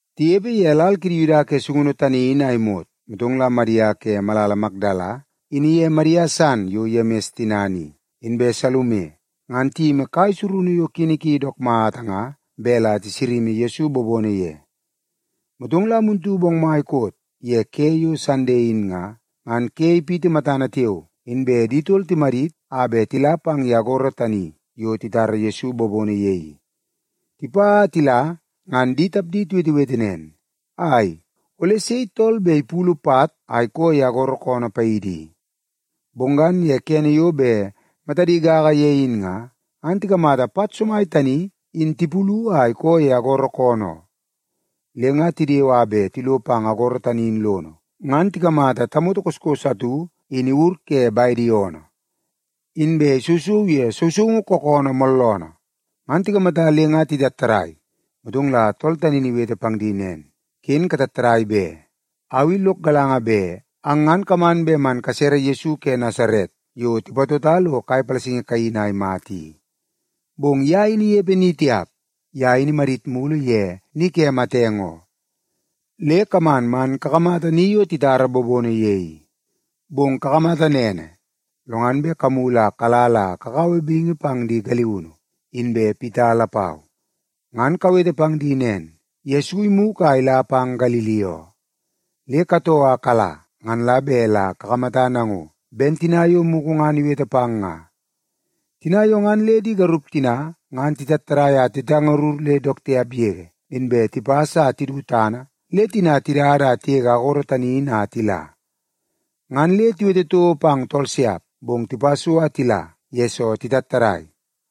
Tinepe ye lal kidi Yuda ke sungunu tani in a imot, motong la Madia ke malala Makdala in iye Madia san yo Yemis tinana i, inbe Salume, ngan tiyimi kai surunu yo kini ki dook mata nga bet la tisalini Yesu bobono ye. Motong la muntu bongmai koot ye ke yo Sande in nga, ngan ke ipiti matana tiao, inbe di tol timadit a bet tila pang ye agoro tani yo titara Yesu bobono ye i. Tipa a tila ngan di tapdi tiwetewete nen, “Ai, ole sei tool bet ipulu pat a ikoo ye agoro koonoo paidi i?” Bong ngan ye kene yo bet matadi gaga ye in nga, ngan tikamata pat somai tani in tipulu a ikoo ye agoro koonoo oo. Le nga tidewe a bet tilo pang agoro tani in lono, ngan tikamata tamoto koskos atu in iwur ke bedi oonoo. Inbe isousou ye sousoungu kookoonoo mooloonoo. Ngan tikamata le nga titattadai. Motong la tool tani in iwete pang di nen, “Ken katattadai be! Au i lok galanga bet ang ngan kaman bet man kasere Yesu ke Nasaret yo tipatota lo kai palasingi kaini a imata i. Bong ye in inepe ni tiap. Ye in imadit mulu ye ni ke matenge oo. Le kaman man kakamata ni yo titara bobono ye i. Bong kakamata nene, lo ngan bet kamulu a kala la kakaua bingi pang di galiunu, inbe Pita lapau. Ngan kawete pang di nen, ‘Yesu imugu a ila pang Galili oo. Le katoo a kala ngan la bet la kakamata nango, ben tina yo mugu ngan iwete pang nga.’” Tina yo ngan le di garup tina ngan titattadai a titangarur le dook tiap yege, inbe tipas a tidu tana le tina tidada a tigege agoro tani in a tila. Ngan le tiwete toko pang tool siap, bong tipa so a tila, yesoo titattadai.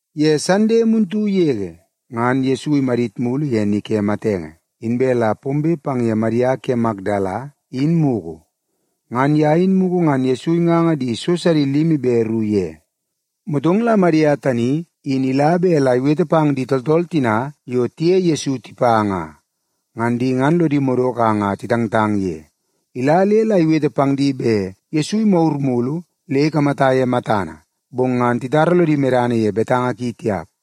Ye Sande muntu yege ngan Yesu imadit mulu ye ni ke matenge, inbe la pombe pang ye Madia ke Makdala in mugu. Ngan ye in mugu ngan Yesu inganga di so sidi limi be ru ye. Motong la Madia tani in ila bet la iwete pang di tooltool tina yo tiye Yesu tipa nga. Ngan di ngan lodi madoko a nga titangtang ye. Ila le la iwete pang di bet Yesu imagur mulu le ikamata ye matana, bong ngan titara lodi medana ye betanga ki tiap.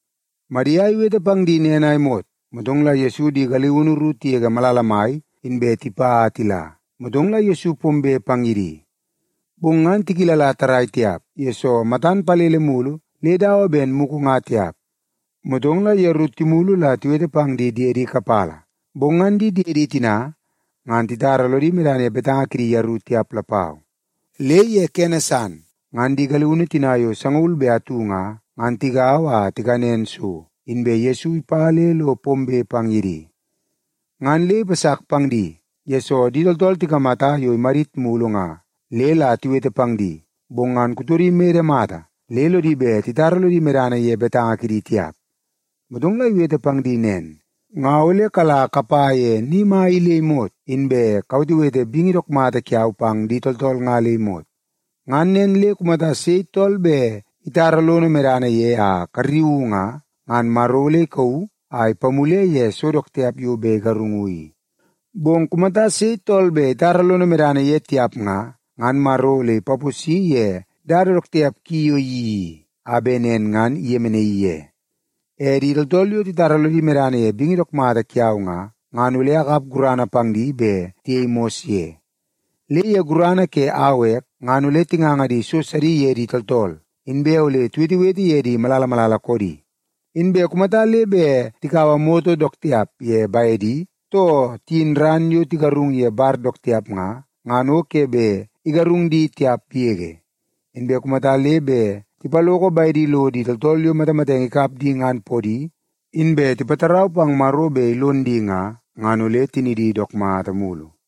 Madia iwete pang di nen a imot, motong la Yesu di galiunu ru tigege malala mai inbe tipa a tila, motong la Yesu pombe pang ye di. Bong ngan tikilala tarrai tiap, yesoo matan palele mulu le dawa ben mugu nga tiap. Motong la yeru timulu la tiwete pang di diedi kapala, bong ngan di diedi tina ngan titara lodi medana ye betanga kidi yeru tiap lapau. Le ye kene san, ngan di galiunu tina yo sangaul be atu nga, ngan tigaua a tikanen so, inbe Yesu ipa le lo pombe pang ye di. Ngan le ipasak pang di, yesoo di tooltool tikamata yo imadit mulu nga le la tiwete pang di, bong ngan kutodi imede mata le lodi bet titara lodi medana ye betanga kidi tiap. Motong la iwete pang di nen, “Nga ole kala kapa ye ni mai i le imot, inbe kawetewete bingi dook mata kiau pang di tooltool nga le imot. Ngan nen le kumata sei tool bet itara lono medana ye a karriuu nga, ngan Maro ole ikauu a ipamule ye so dook tiap yo bet igarungu i. Bong kumata sei tool bet itara lono medana ye tiap nga, ngan Maro ole ipaposi ye dada dook tiap ki yo iyeii i, a bet nen ngan iyemenaii ye. E di tooltool yo titara lodi medana ye bingi dook mata kiau nga, ngan ole akap gurana pang di bet tiyei mos ye. Le ye gurana ke au ek, ngan ole tinganga di so sidi ye di tooltool, inbe ole tiwetewete ye di malala malala koodi. Inbe kumata le bet tikaua moto dook tiap ye bedi, too tiyin ran yo tigarung ye bar dook tiap nga, ngan o ke bet igarung di tiap yege. Inbe kumata le bet tipaloko bedi lo di tooltool yo matamatenge ikap di ngan podi, inbe tipatarau pang Maro bet ilon di nga, ngan ole tinidi dook mata mulu.”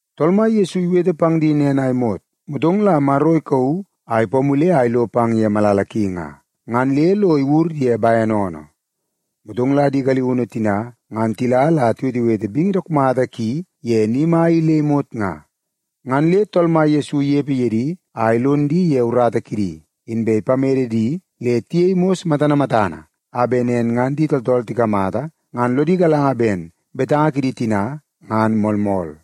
Tool Mai Yesu iwete pang di nen a imot, motong la Maro ikauu a ipamule a ilo pang ye malala ki nga, ngan le lo iwur ye bene oonoo. Motong la di galiunu tina ngan tila la tiwetewete bingi dook mata ki ye ni mai i le imot nga. Ngan le Tool Mai Yesu inepe ye di a ilon di ye urata kidi, inbe ipamede di le tiyei mos matana matana a bet nen ngan di tooltool tikamata ngan lodi galanga ben betanga kidi tina ngan moolmool.